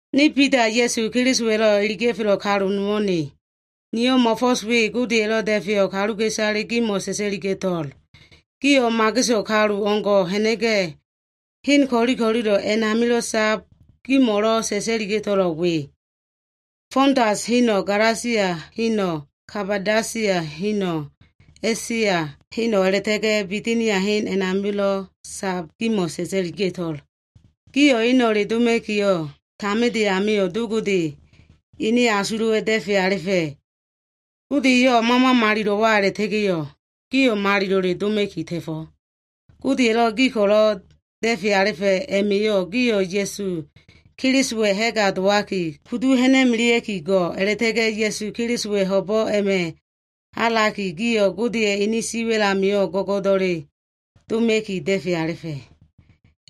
Ne Bida, Ya꞉su Kelisowa꞉lo꞉ iliga꞉felo꞉ kalu nowo꞉ ne. Niyo꞉ mo꞉fo꞉s we Godeya꞉lo꞉ da꞉feyo꞉ kaluka꞉isale gimo꞉ sa꞉sa꞉liga꞉to꞉l. Gio꞉ mageso꞉ kalu o꞉ngo꞉ ha꞉na꞉ga꞉, hen ko꞉li ko꞉lilo꞉ amio꞉lo꞉ sab gimo꞉lo꞉ sa꞉sa꞉liga꞉to꞉lo꞉ we. Fontus heno꞉, Galasia heno꞉, Kabadosia heno꞉, A꞉sia heno꞉ a꞉la꞉ta꞉ga꞉ Bitinia hen amilo꞉ sab gimo꞉ iliga꞉to꞉l. Gio꞉ eno꞉le doma꞉kiyo꞉, taminde amio꞉ Do Godeya꞉ ene asulo꞉wa꞉yo꞉ da꞉fe alifa꞉. Gode eyo꞉ Mama Malilo꞉wa a꞉la꞉ta꞉ga꞉yo꞉ gio꞉ malilo꞉le doma꞉ki ta꞉fo꞉. Godeya꞉lo꞉ gi ko꞉lo꞉ da꞉fe alifa꞉ a꞉ma꞉yo꞉, gio꞉ Ya꞉su Kelisowa꞉ ha꞉ga dowaki kudu hamana꞉ki go꞉. A꞉la꞉ta꞉ga꞉ Ya꞉su Kelisowa꞉ ho꞉bo꞉ a꞉ma꞉ halaki, gio꞉ Godeya꞉ ene siwa꞉l amio꞉ go꞉go꞉do꞉le doma꞉ki da꞉fe alifa꞉.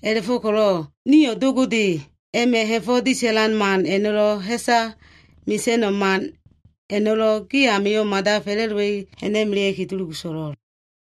A꞉la꞉fo꞉ko꞉lo꞉ niyo꞉ Do Godeya꞉ a꞉ma꞉ ha꞉fo꞉ disa꞉lan man a꞉no꞉lo꞉, ha꞉sa mesa꞉no꞉ man a꞉no꞉lo꞉ gi amio꞉ mada fa꞉la꞉dowa꞉i ha꞉na꞉melea꞉ki dulugu so꞉lo꞉l.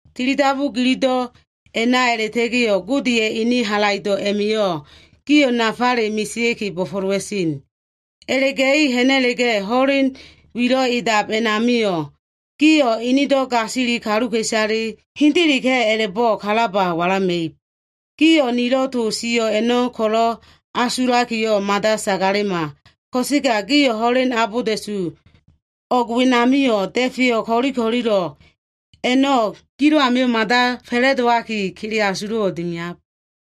Tilidabu gilido꞉ a꞉na a꞉la꞉ta꞉ga꞉yo꞉, Godeya꞉ ene halaido꞉ a꞉ma꞉yo꞉ gio꞉ nafale mesea꞉ki bo꞉fo꞉lowa꞉sen. A꞉la꞉ga꞉i ha꞉na꞉la꞉ga꞉, ho꞉len welo꞉ edab a꞉namio꞉, gio꞉ enedo꞉ gasili kaluka꞉isale hendeleka꞉ a꞉la꞉bo꞉ kalaba walama꞉ib. Gio꞉ nilo꞉ to sio꞉ a꞉no꞉ ko꞉lo꞉ asulakiyo꞉ mada sagalema. Ko꞉sega gio꞉ ho꞉len abolda꞉su o꞉g wenamio꞉, da꞉feyo꞉ ko꞉li ko꞉lilo꞉ a꞉no꞉ gilo꞉ amio꞉ mada fa꞉la꞉dowaki, kele asulo꞉wo꞉ dimiab.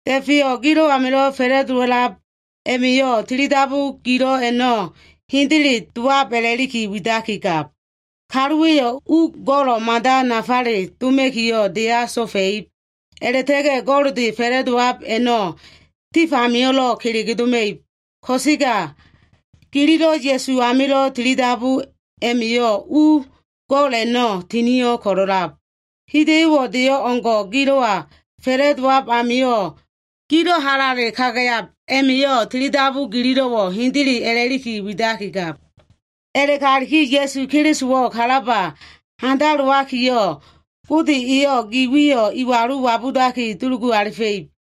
Da꞉feyo꞉ gi amilo꞉ fa꞉la꞉dowa꞉lab a꞉ma꞉yo꞉ tilidabu gilo꞉ a꞉no꞉ hendele dowab a꞉la꞉li widaki gab. Kaluwa꞉yo꞉ u go꞉lo꞉ mada nafale doma꞉kiyo꞉ deya so꞉fa꞉ib. A꞉la꞉ta꞉ga꞉ go꞉lde fa꞉la꞉dowab a꞉no꞉ tif amio꞉lo꞉ kelege doma꞉ib. Ko꞉sega gililo꞉ Ya꞉su amilo꞉ tilidabu a꞉ma꞉yo꞉ u go꞉l a꞉no꞉ tinio꞉ ko꞉lo꞉lab. Hida꞉yo꞉wo꞉ de o꞉ngo꞉ gilo꞉wa fa꞉la꞉dowab amio꞉, gilo꞉ halale kagayab a꞉ma꞉yo꞉ tilidabu gililo꞉wo꞉ hendele a꞉la꞉li widaki gab. A꞉la꞉galiki Ya꞉su Kelisowo꞉ kalaba handalowakiyo꞉, Gode eyo꞉ gi wiyo꞉ iwalu wabudaki dulugu alifa꞉ib.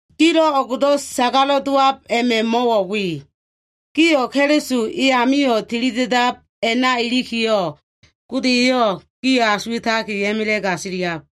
Gilo꞉ o꞉gdo꞉ sagalo꞉ dowab a꞉no꞉ mo꞉wo꞉ we. Gio꞉ Keliso eyamio꞉ tili da꞉dab a꞉na ilikiyo꞉ Gode eyo꞉ gio꞉ asuwa꞉taki a꞉ma꞉la꞉ gasiliab.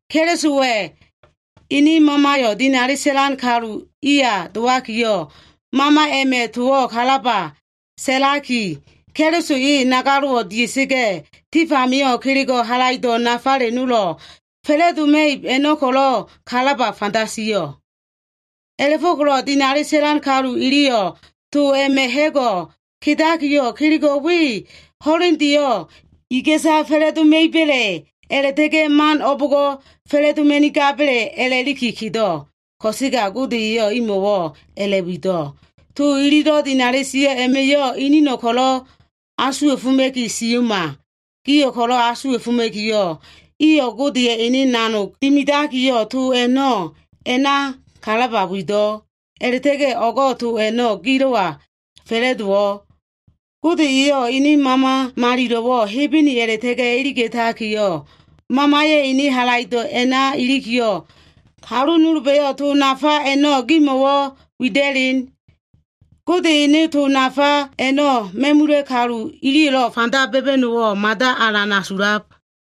Kelisowa꞉ ene Mamayo꞉ dinali sa꞉lan kalu iya dowakiyo꞉, Mama a꞉ma꞉yo꞉ towo꞉ kalaba sa꞉laki, Keliso e nagalo꞉wo꞉ dia꞉sa꞉ga꞉, tif amio꞉ kelego꞉ halaido꞉ nafale nolo꞉ fa꞉la꞉doma꞉ib a꞉no꞉ ko꞉lo꞉ kalaba fanda sio꞉. A꞉la꞉fo꞉ko꞉lo꞉ dinali sa꞉lan kalu iliyo꞉ to a꞉ma꞉ ha꞉go꞉ kedakiyo꞉, kelego꞉ a꞉no꞉ ho꞉lendeyo꞉ iga꞉sa fa꞉la꞉doma꞉iba꞉le a꞉la꞉ta꞉ga꞉ man o꞉bo꞉ngo꞉ fa꞉la꞉doma꞉nigaba꞉le a꞉la꞉liki kedo꞉. Ko꞉sega Gode eyo꞉ imo꞉wo꞉ a꞉la꞉wido꞉. To ililo꞉ dinali sio꞉ a꞉ma꞉yo꞉, inino꞉ ko꞉lo꞉ asuwa꞉foma꞉ki sio꞉ma. Gio꞉ ko꞉lo꞉ asuwa꞉foma꞉kiyo꞉, iyo꞉ Godeya꞉ ene nanog dimidakiyo꞉ to a꞉no꞉ a꞉na kalaba wido꞉. A꞉la꞉ta꞉ga꞉ o꞉go꞉ to a꞉no꞉ gilo꞉wa fa꞉la꞉dowo꞉. Gode eyo꞉ ene Mama Malilo꞉wo꞉ Hebene a꞉la꞉ta꞉ga꞉ iliga꞉takiyo꞉, Mamaya꞉ ene halaido꞉ a꞉na ilikiyo꞉, kalu nolba꞉yo꞉ to nafa a꞉no꞉ gimo꞉wo꞉ wida꞉len. Gode ene to nafa a꞉no꞉ ma꞉mula꞉ kalu iliyo꞉lo꞉ fanda ba꞉ba꞉no꞉wo꞉ mada alan asulab.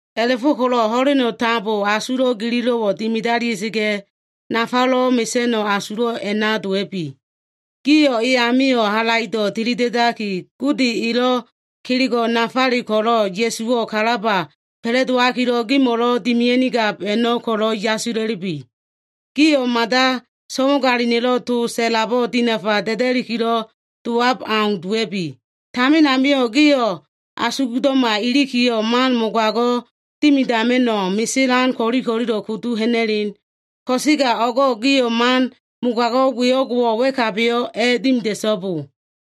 A꞉la꞉fo꞉ko꞉lo꞉ ho꞉leno꞉ tambowo꞉ asulo꞉ gililo꞉wo꞉ dimidalia꞉sa꞉ga꞉, nafalelo꞉ mesa꞉no꞉ asulo꞉ a꞉na dowa꞉bi. Gio꞉ e amio꞉ halaido꞉ tilida꞉daki, Gode elo꞉ kelego꞉ nafale ko꞉lo꞉ Ya꞉suwo꞉ kalaba fa꞉la꞉dowalikilo꞉ gimo꞉lo꞉ dimidama꞉nigab a꞉no꞉ ko꞉lo꞉ yasila꞉lubi. Gio꞉ mada so꞉wagalina꞉lo꞉ to sa꞉labo꞉ dinafa da꞉dakilo꞉ dowab au dowa꞉bi. Tamin amio꞉ gio꞉ asulo꞉lo꞉ma ilikiyo꞉, man mogago꞉ dimidama꞉no꞉ meselan ko꞉li ko꞉lilo꞉ kudu ha꞉na꞉len. Ko꞉sega o꞉go꞉ gio꞉ man mogago꞉ we o꞉ngo꞉wo꞉ wa꞉kabiyo꞉ a꞉dimida꞉so꞉bo.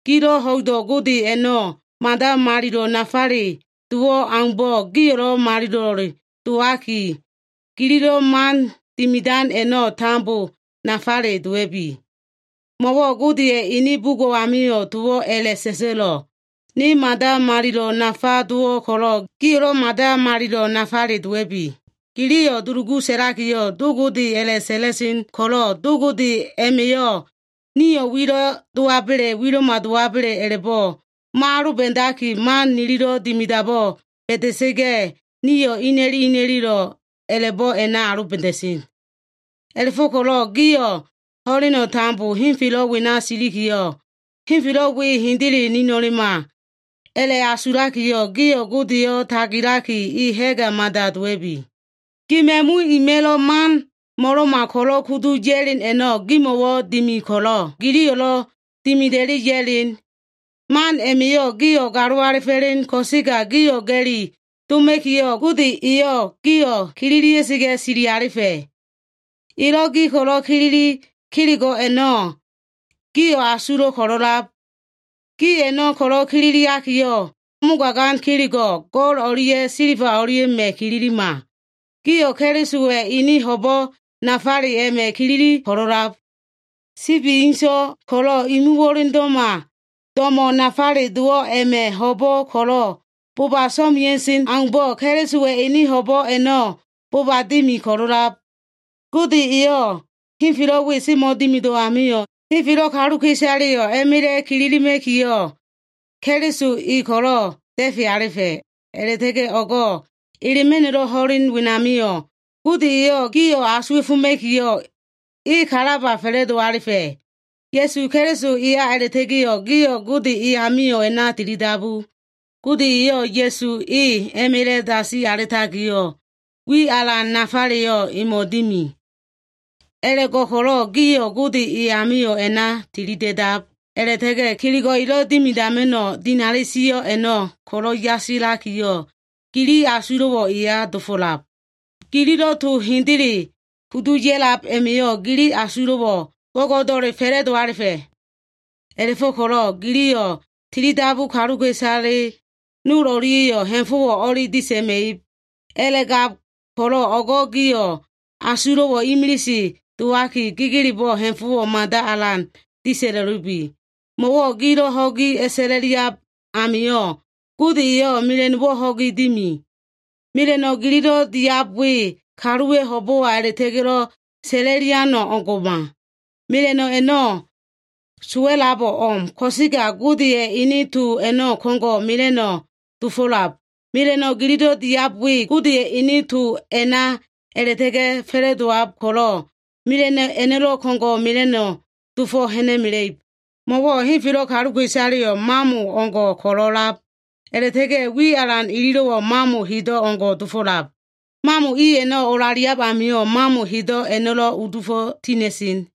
Gilo꞉ ho꞉ido꞉ Gode a꞉no꞉ mada malilo꞉ nafale dowo꞉ aumbo꞉ gio꞉lo꞉ malilo꞉ dowaki, gililo꞉ man dimidan a꞉no꞉ tambo nafale dowa꞉bi. Mo꞉wo꞉ Godeya꞉ ene bugo꞉ amio꞉ towo꞉ a꞉la꞉sa꞉sa꞉lo꞉, “Ne mada malilo꞉ nafale dowo꞉ ko꞉lo꞉, gio꞉lo꞉ mada malilo꞉ nafale dowa꞉bi.” Giliyo꞉ dulugu sa꞉lakiyo꞉ Do Gode a꞉la꞉sa꞉la꞉sen ko꞉lo꞉, do a꞉ma꞉yo꞉ nio꞉ wilo꞉ dowaba꞉le wilo꞉ma dowaba꞉le a꞉la꞉bo꞉ mo꞉aloba꞉daki, man nililo꞉ dimidabo꞉ ba꞉da꞉sa꞉ga꞉, nio꞉ ina꞉li ina꞉li a꞉la꞉bo꞉ a꞉na aloba꞉da꞉sen. A꞉la꞉fo꞉ko꞉lo꞉ gio꞉ ho꞉leno꞉ tambo henfelo꞉ wena silikiyo꞉, henfelo꞉ we hendele nilino꞉ma a꞉la꞉asulakiyo꞉, gio꞉ Godeyo꞉ tagilaki, e ha꞉ga mada dowa꞉bi. Gi ma꞉mu ima꞉lo꞉ man mo꞉lo꞉ma ko꞉lo꞉ kudu ya꞉len a꞉no꞉ gimo꞉wo꞉ dimi ko꞉lo꞉, giliyo꞉lo꞉ dimida꞉i ya꞉len. Man a꞉ma꞉yo꞉ gio꞉ galo alifo꞉len ko꞉sega, gio꞉ ga꞉li doma꞉kiyo꞉, Gode eyo꞉ gio꞉ kililia꞉sa꞉ga꞉ sili alifa꞉. Elo꞉ gi ko꞉lo꞉ kilili kelego꞉ a꞉no꞉ gio꞉ asulo꞉ ko꞉lo꞉lab. Gi a꞉no꞉ ko꞉lo꞉ kililiakiyo꞉, mogagan kelego꞉ go꞉l o꞉lia꞉ silba o꞉lia꞉ma꞉ kililima. Gio꞉ Kelisowa꞉ ene ho꞉bo꞉ nafale a꞉ma꞉ kilili ko꞉lo꞉lab. Sibi inso꞉ ko꞉lo꞉ imu wo꞉lendo꞉ma, do꞉mo꞉wo꞉ nafale dowo꞉ a꞉ma꞉ ho꞉bo꞉ ko꞉lo꞉ boba so꞉mea꞉sen aumbo꞉, Kelisowa꞉ ene ho꞉bo꞉ a꞉no꞉ boba dimi ko꞉lo꞉lab. Gode eyo꞉ henfelo꞉ we semo꞉ dimido꞉ amio꞉, henfelo꞉ kaluka꞉isaleyo꞉ a꞉ma꞉la꞉ kililima꞉kiyo꞉, Keliso e ko꞉lo꞉ da꞉fe alifa꞉. A꞉la꞉ta꞉ga꞉ o꞉g elema꞉no꞉lo꞉ ho꞉len wenamio꞉, Gode eyo꞉ gio꞉ asuwa꞉foma꞉kiyo꞉, e kalaba fa꞉la꞉do alifa꞉. Ya꞉su Keliso eya a꞉la꞉ta꞉ga꞉yo꞉ gio꞉ Gode e amio꞉ a꞉na tilidabu. Gode eyo꞉ Ya꞉su e a꞉ma꞉la꞉ dasi alitakiyo꞉, wi alan nafaleyo꞉ emo꞉ dimi. A꞉la꞉go꞉ko꞉lo꞉ gio꞉ Gode e amio꞉ a꞉na tilida꞉da꞉lab a꞉la꞉ta꞉ga꞉, kelego꞉ elo꞉ dimidama꞉no꞉ dinali sio꞉ a꞉no꞉ ko꞉lo꞉ yasila꞉likiyo꞉ gili asulo꞉wo꞉ eya dia꞉fo꞉lab. Gililo꞉ to hendele kudu ya꞉lab a꞉ma꞉yo꞉, gili asulo꞉wo꞉ go꞉go꞉do꞉le fa꞉la꞉do alifa꞉. A꞉la꞉fo꞉ko꞉lo꞉ giliyo꞉ tilidabu kaluka꞉isale nol o꞉lia꞉yo꞉ ha꞉fo꞉wo꞉ o꞉li disa꞉ma꞉ib. A꞉la꞉gab ko꞉lo꞉ o꞉go꞉ gio꞉ asulo꞉wo꞉ imilise dowaki, gegelebo꞉ ha꞉fo꞉wo꞉ mada alan disa꞉la꞉lubi. Mo꞉wo꞉ gio꞉ ho꞉gi a꞉sa꞉la꞉liab amio꞉, Gode eyo꞉ mela꞉no꞉wo꞉ ho꞉gi dimi. Mela꞉no꞉ gililo꞉ diab we, kaluwa꞉ ho꞉bo꞉wa a꞉la꞉ta꞉ga꞉lo꞉ sa꞉la꞉lian o꞉ngo꞉ma. Mela꞉no꞉ a꞉no꞉ sowa꞉labo꞉ o꞉m. Ko꞉sega Godeya꞉ ene to a꞉no꞉ ko꞉ngo꞉ mela꞉no꞉ dofo꞉lab. Mela꞉no꞉ gililo꞉ diab we, Godeya꞉ ene to a꞉na a꞉la꞉ta꞉ga꞉ fa꞉la꞉dowab ko꞉lo꞉, mela꞉no꞉ a꞉no꞉lo꞉ ko꞉ngo꞉ mela꞉no꞉ dofo꞉ ha꞉na꞉mela꞉ib. Mo꞉wo꞉ “Henfelo꞉ kaluka꞉isaleyo꞉ mamo i o꞉ngo꞉ ko꞉lo꞉ a꞉lab, a꞉la꞉ta꞉ga꞉ wi alan ililo꞉wo꞉ mamo hedo꞉ o꞉ngo꞉ dofo꞉lab. Mamo i a꞉no꞉ olaliab amio꞉, mamo hedo꞉ a꞉no꞉lo꞉ udufo꞉ tina꞉sen.